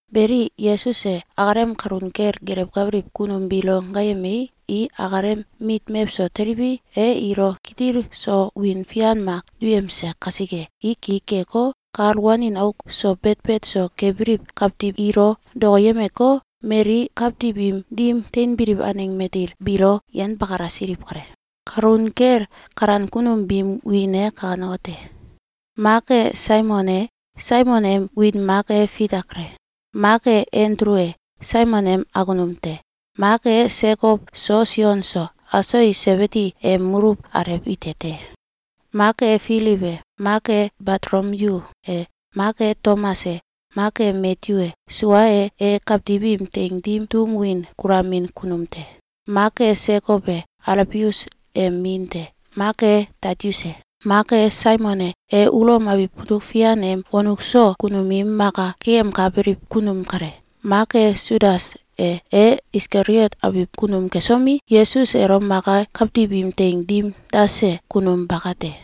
Beli, Yesus e akalem kalun kel gelewkabiliw kunum biilo gaayemei, i akalem mit mewso teliwi, e ilo kitil so wiin fian mak duyemse kasike, i ki keko, kal wanin auk so betbet so kebiliw kawtiw ilo dokoyemeko, mali kawtiw im dim teinbiliw aneng matil biilo yenbakalasiliw kale. Kalun kel kalan kunum biim wiin e kanekote: Mak e Saimon e — Saimon em wiin mak e Fita kale. Mak e Andulu e — Saimon em akunum te. Mak e Sekow so Sion so — Aso i Sebidi em muluw alew ite te. Mak e Filiw e mak e Batolomyu e mak e Tomas e mak e Matyu e — Sua e, e kawtiw im teing dim tum win kulamin kunum te. Mak e Sekow e — Alfius em min te. Mak e Tadius e mak e Saimon e — E Ulom abiw mutuk fian em wonuk so kunum im maka keyemkabiliw kunum kale. Mak e Sudas e — E Iskaliot abiw kunum kesomi, Yesus elo maka kawtiw im teing dim dase kunum baka te.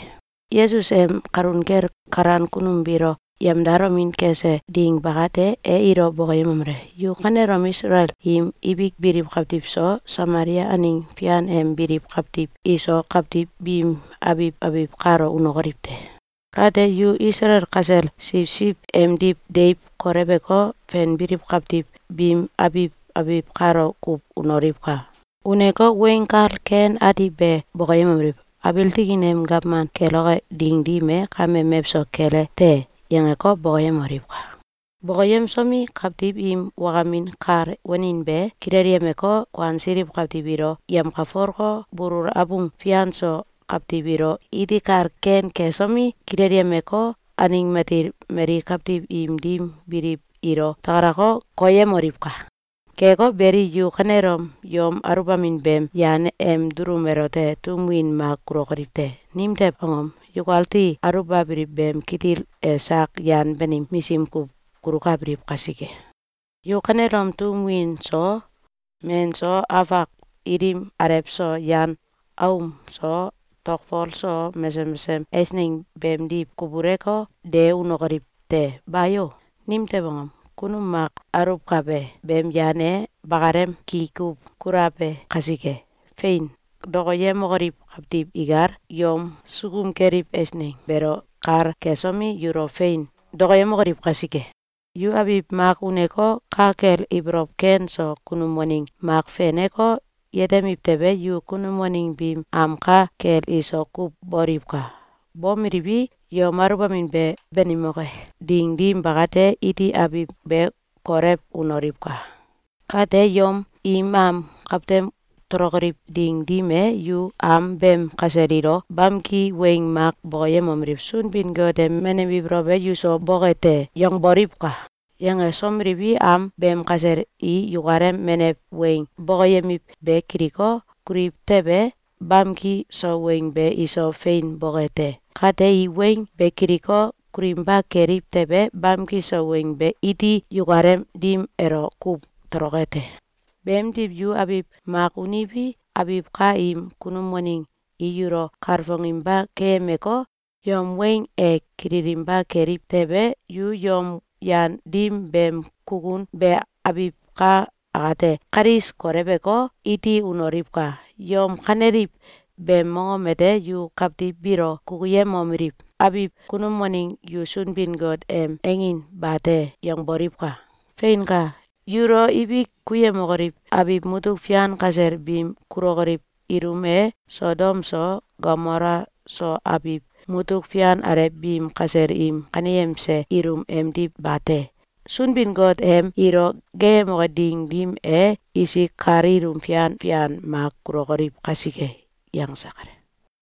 Yesus em kalun kel kalan kunum biilo yemdalomin kese ding bakate, e ilo bokoyemomele: “Yu kanelom Isalael im ibik biliw kawtiw so, Samalia aneng fian em biliw kawtiw iso, kawtiw biim abiw abiw kalo unokoliw te! Kate, yu Isalael kasel siwsiw emdiw deiw kolewko, fenbiliw kawtiw biim abiw abiw kalo kuw unoliwka! Uneko, Weng Kal Ken Ati be bokoyemomeliw: ‘Abiil tikin em gawman keloke ding dim e, kame mewso kele te!’, yangeko, bokoyemoliwka! Bokoyemsomi, kawtiw im wakamin kal wanin be kilelyemeko, kuansiliw kawtiw ilo yemkalfoleko, bulul abung fian so kawtiw ilo iti kal ken kesomi, kilelyemeko, aneng matil mali kawtiw im dim biliw ilo takalako, koyemoliwka! Keko beli, yu kanelom yom aulbamin beem yan em dulum elote tum win mak kulokoliw te! Nimtew angom? Yukati aulbabiliw beem kitil e sak yan banim misim kuw kulukabiliw kasike. Yu kanelom tum win so, men so, afak ilim alew so, yan aom so, tokfol so, mesesem mesesem eisneng beemdiw kubuleko, de unokoliw te! Bayo! Nimtew angom? Kunum mak aluwkabe beem yan e bakalem ki kuw kulabe kasike. Fein! Dokoyemokoliw kawtiw ikal yom sukum keliw eisneng beelo kal kesomi, yulo fein dokoyemokoliw kasike. Yu abiw mak uneko, ka kel ibolow ken so kunum waneng mak feneko, yetemiw tewe, yu kunum waneng biim am ka kel iso kuw boliwka! Bomeliwi, yom aluwbamin be banimoke ding dim bakate, iti abiw be kolew unoliwka! Kate, yom im am kawtem tolokoliw ding dim e, yu am beem kasel ilo bamki weng mak bokoyemomeliw: “Sunbin-Got em menew ibolow e yuso boke te!’, yangboliwka! Yangesomeliwi, am beem kasel i yukalem menew weng bokoyemiw be kiliko, kuliw tewe, bamki so weng be iso fein boke te. Kate, i weng be kiliko, kulinba keliw tewe, bamki so weng be iti yukalem dim elo kuw toloke te. Beemdiw, yu abiw mak uniwi, abiw ka im kunum waneng i yulo kalfonginba keyemeko, yom weng e kililinba keliw tewe, yu yom yan dim beem kukun be abiw ka akate kalis koleweko, iti unoliwka! Yom kaneliw beem mongom ete yu kawtiw biilo kukuyemomeliw: ‘Abiw kunum waneng yu Sunbin-Got em angin bate!’, yangboliwka! Feinka! Yulo ibik kuyemokoliw abiw mutuk fian kasel biim kulokoliw ilum e Sodom so Gomola so abiw mutuk fian alew biim kasel im kaneyemse ilum emdiw bate! Sunbin-Got em ilo geeyemoke ding dim e, isik kal ilum fian fian mak kulokoliw kasike.”, yangse kale.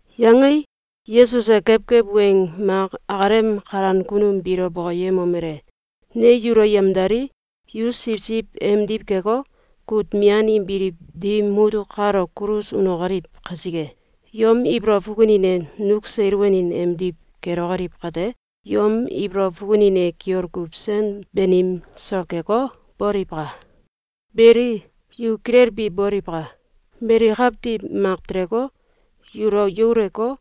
Yangei, Yesus e kewkew weng mak akalem kalan kunum biilo bokoyemomele: “Ne yulo yamdalii, yu siwsiw emdiw keko, kut mian im biliw dim mutuk kalo kulus unokoliw kasike, yom ibolow fukunin e nuk seil wanin emdiw kelokoliw kate, yom ibolow fukunin e kiol kuw sen banim so keko, boliwka! Beli, yu kilelbi boliwka! Mali kawtiw mak teleko, yulo yauleko,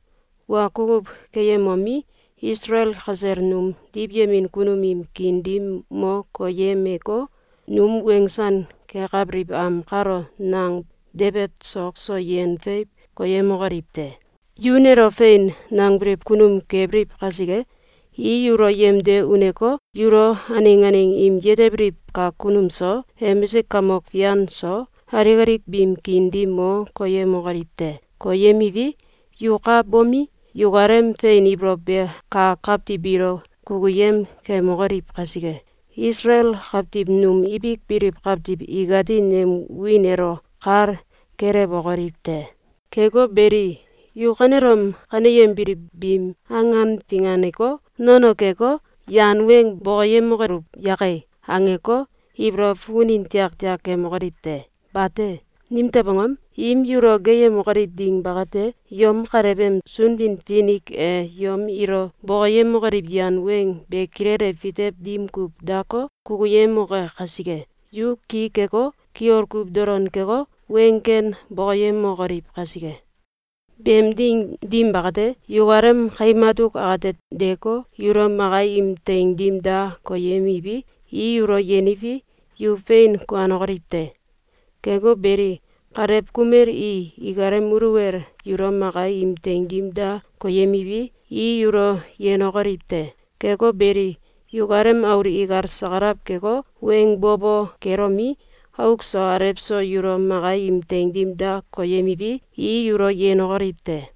wa kukuw keyemomi, Isalael kasel num diwyemin kunum im kiin dim mo koyemeko, num wensan kekabiliw am kalo nang debet sok so yen feiw koyemokoliw te. Yu nelo ‘Fein!’, nangbiliw kunum kebiliw kasike, i yulo yemde uneko, yulo aneng aneng im yetebiliw kak kunum so, emisik kamok fian iso, alik alik biim kiin dim mo koyemokoliw te. Koyemiwi, yu ka bomi, yukalem fein ibolow be kak kawtiw biilo kukuyem kemokoliw kasike, Isalael kawtiw num ibik biliw kawtiw ikati nem wiin elo kal kelewokoliw te. Keko beli, yu kanelom kaneyembiliw biim angan finganeko, ‘Nono keko, yan weng bokoyemokoluw yake!’, angeko, ibolow fukunin tiaktiak kemokoliw te! Bate! Nimtew angom? Im yulo geeyemokoliw ding bakate, yom Kalew em Sunbin-Finik e yom ilo bokoyemokoliw yan weng be kilele fitew dim kuw dako, kukuyemoke kasike, yu ki keko, kiol kuw dolon keko, weng ken bokoyemokoliw kasike. Beem ding dim bakate, yukalem kaim atuk akate deeko, yulo maka im teing dim da koyemiwi, i yulo yeniwi, yu fein kuanokoliw te. Keko beli, kalew kumel i ikalem muluwel yulo maka im teing dim da koyemiwi, i yulo yenokoliw te. Keko beli, yukalem aul ikal sakalaw keko, weng bo bo kelomi, auk so alew so yulo maka im teing dim da koyemiwi, i yulo yenokoliw te.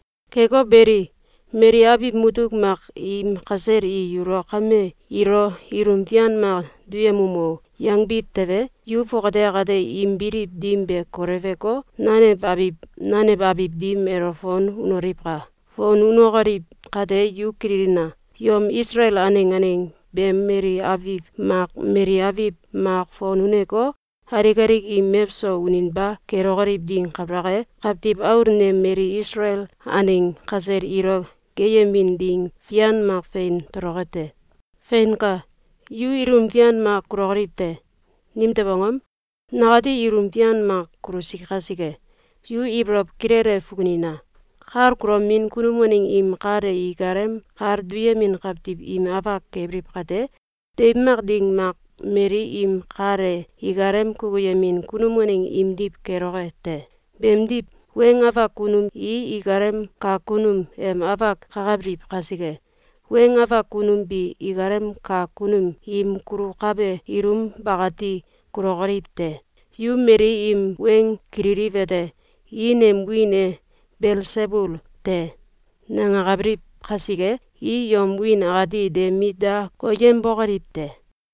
Keko beli, mali abiw mutuk mak im kasel i yulo ‘Kame, ilo ilum fian mak duyemum o!’, yangbiw tewe, yu fongate akate im biliw dim be koleweko, nanew abiw nanew abiw dim elo fon unoliwka! Fon unokoliw kate yu kililina! Yom Isalael aneng aneng beem mali abiw mak mali abiw mak fon uneko, alik alik im mewso uninba kelokoliw ding kabalak e, Kawtiw Aul nem mali Isalael aneng kasel ilo geeyemin ding fian mak fein toloke te. Feinka! Yu ilum fian mak kulokoliw te. Nimtew angom? Nakati ilum fian mak kulusi kasike. Yu ibolow kilele fukunina! Kal kulomin kunum waneng im kal e ikalem kal duyemin kawtiw im afak kebiliw kate, deiw mak ding mak mali im kal e ikalem kukuyemin kunum waneng imdiw keloke te. Beemdiw, weng afak kunum i ikalem kak kunum em afak kakabiliw kasike, weng afak kunum bi ikalem kak kunum im kulukabe ilum bakati kulokoliw te. Yu mali im weng kililiwete: I nem wiin e ‘Belsebul te!’, nangakabiliw kasike, i yom wiin akati de mit da koyembokoliw te.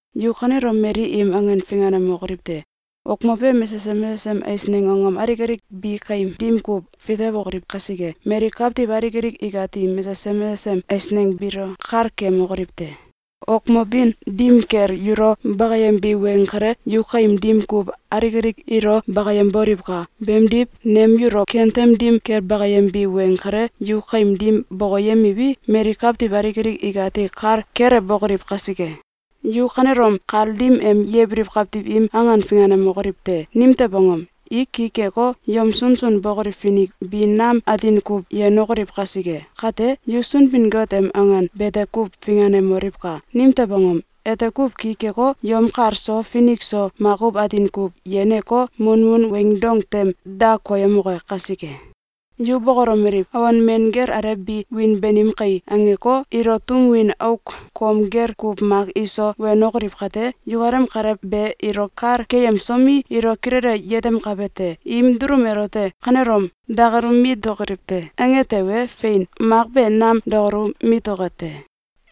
Yu kanelom mali im angan finganemokoliw te! Wokmobe mesesem mesesem eisneng angom alik alik bi kaim dim kuw fitewokoliw kasike, mali kawtiw alik alik ikati mesesem mesesem eisneng biilo kal keyemokoliw te. Wokmobin dim kel yulo bakayembi weng kale, yu kaim dim kuw alik alik ilo bakayemboliwka! Beemdiw, nem yulo kentem dim kel bakayembi weng kale, yu kaim dim bokoyemiwi, mali kawtiw alik alik ikati kal kelewbokoliw kasike! Yu kanelom kal dim em yebiliw kawtiw im angan finganemokoliw te! Nimtew angom? I ki keko, yom sunsun bokoliw finik bi nam atin kuw yenokoliw kasike. Kate, yu Sunbin-Got em angan bete kuw finganemoliwka! Nimtew angom? Ete kuw ki keko, yom kal so finik so makuw atin kuw yeneko, munmun weing dong tem da koyemoke kasike. Yu bokolomeliw: ‘Awon men gel alew bi wiin banim kai!’, angeko, ilo tum win auk kom gel kuw mak iso wenokoliw kate, yukalem Kalew be ilo kal keyemsomi, ilo kilele yetemkabe te. Im dulum elote ‘Kanelom dakalu mitokoliw te!’, ange tewe, fein, mak be nam dakalu mitoke te.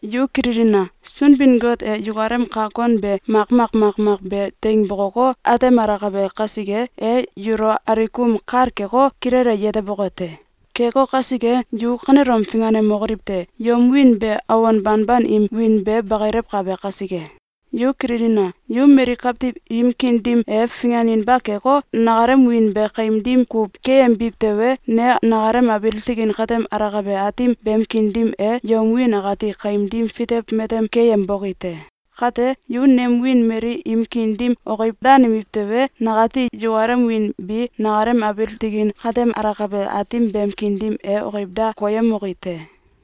Yu kililina! Sunbin-Got e yukalem kak kon be makmak makmak be teing bokoko, atemalakabe kasike, e yulo alikum kal keko, kilele yeteboke te. Keko kasike, yu kanelom finganemokoliw te! Yom wiin be awon banban im wiin be bakilewkabe kasike. Yu kililina! Yu mali kawtiw im kiin dim e finganinba keko, nakalem wiin be kaim dim kuw keyembiw tewe, ne nakalem abiil tikin katem alakabe Aatim beem kiin dim e yom wiin akati kaim dim fitew matem keyemboki te. Kate, yu nem wiin mali im kiin dim okiw danemiw tewe, nakati yukalem wiin bi nakalem abiil tikin katem alakabe Aatim beem kiin dim e okiw da koyemoki te.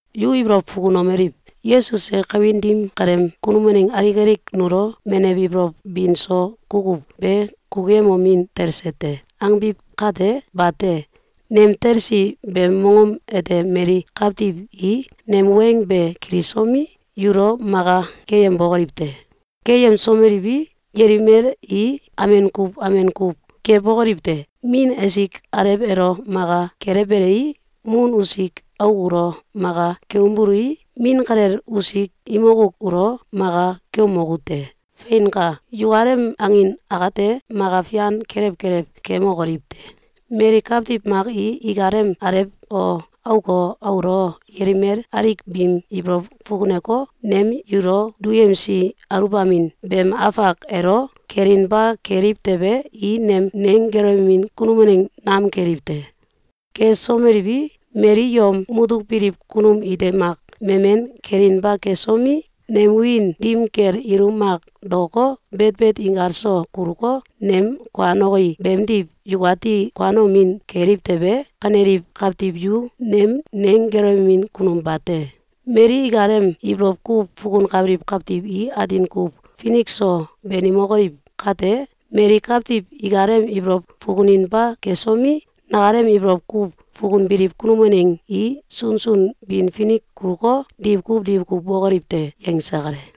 Yu ibolow fukunomeliw: ‘Yesus e kawin dim kaleem kunum waneng alik alik nulo menew ibolow bin so kukuw be kukuyemomin talse te.’, angbiw kate, bate! Nem talsi beem mongom ete mali kawtiw i nem weng be kilisomi, yulo maka keyembokoliw te. Keyemsomeliwi, yelimel i amen kuw amen kuw kebokoliw te. Min esik alew elo maka kelewbelei, mun usik auk ulo maka keumbului, min kalel usik imok auk ulo maka keumoku te. Feinka! Yukalem angin akate, maka fian kelew kelew keemokoliw te. Mali kawtiw mak i ikalem alew o, auk o, aul o, yelimel alik biim ibolow fukuneko, nem yulo duyemsi aluwbamin beem afak elo kelinba keliw tewe, i nem neggelewemin kunum waneng nam keliw te. Kesomeliwi, mali yom mutuk biliw kunum ite mak memen kelinba kesomi, nem wiin dim kel ilum mak daoko, betbet inkal so kuluko, nem kuanoki beemdiw yukati kuanomin keliw tewe, kaneliw kawtiw yu nem neggelewemin kunum bate. Mali ikalem ibolow kuw fukunkabiliw kawtiw i atin kuw finik so banimokoliw kate, mali kawtiw ikalem ibolow fukuninba kesomi, nakalem ibolow kuw fukunbiliw kunum waneng i sunsun bin finik kuluko, diwkuw diwkuw bokoliw te.”, yangse kale.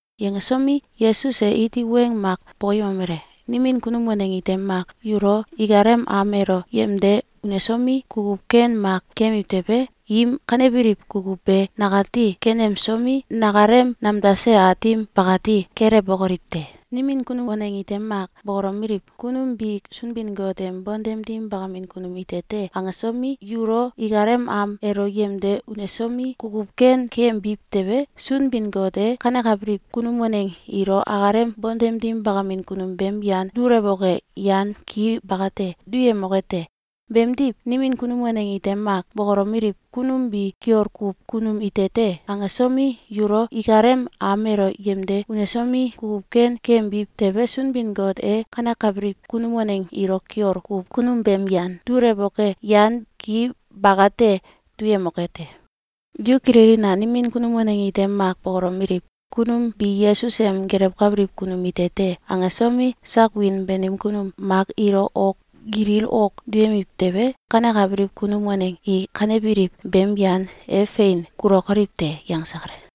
Yangesomi, Yesus e iti weng mak bokoyemomele: “Nimin kunum waneng ite mak yulo ikalem am elo yemde unesomi, kukuw ken mak keyemiw tewe, im kanebiliw kukuw be nakati kenemsomi, nakalem nemdase Aatim bakati kelewbokoliw te. Nimin kunum waneng ite mak bokolomeliw: ‘Kunum bi Sunbin-Got em bontem dim bakamin kunum ite te!’, angesomi, yulo ikalem am elo yemde unesomi, kukuw ken keyembiw tewe, Sunbin-Got e kanekabiliw kunum waneng ilo akalem bontem dim bakamin kunum beem yan dulewoke yan ki bakate duyemoke te. Beemdiw, nimin kunum waneng ite mak bokolomeliw: ‘Kunum bi kiol kuw kunum ite te!’, angesomi, yulo ikalem am elo yemde unesomi, kukuw ken keyembiw tewe, Sunbin-Got e kanekabiliw kunum waneng ilo kiol kuw kunum beem yan dulewoke yan ki bakate duyemoke te. Yu kililina! Nimin kunum waneng ite mak bokolomeliw: ‘Kunum bi Yesus em gelewkabiliw kunum ite te!’, angesomi, sak wiin banim kunum mak ilo ok gilil ok duyemiw tewe, kanekabiliw kunum waneng i kanebiliw beem yan e fein kulokoliw te.”, yangse kale.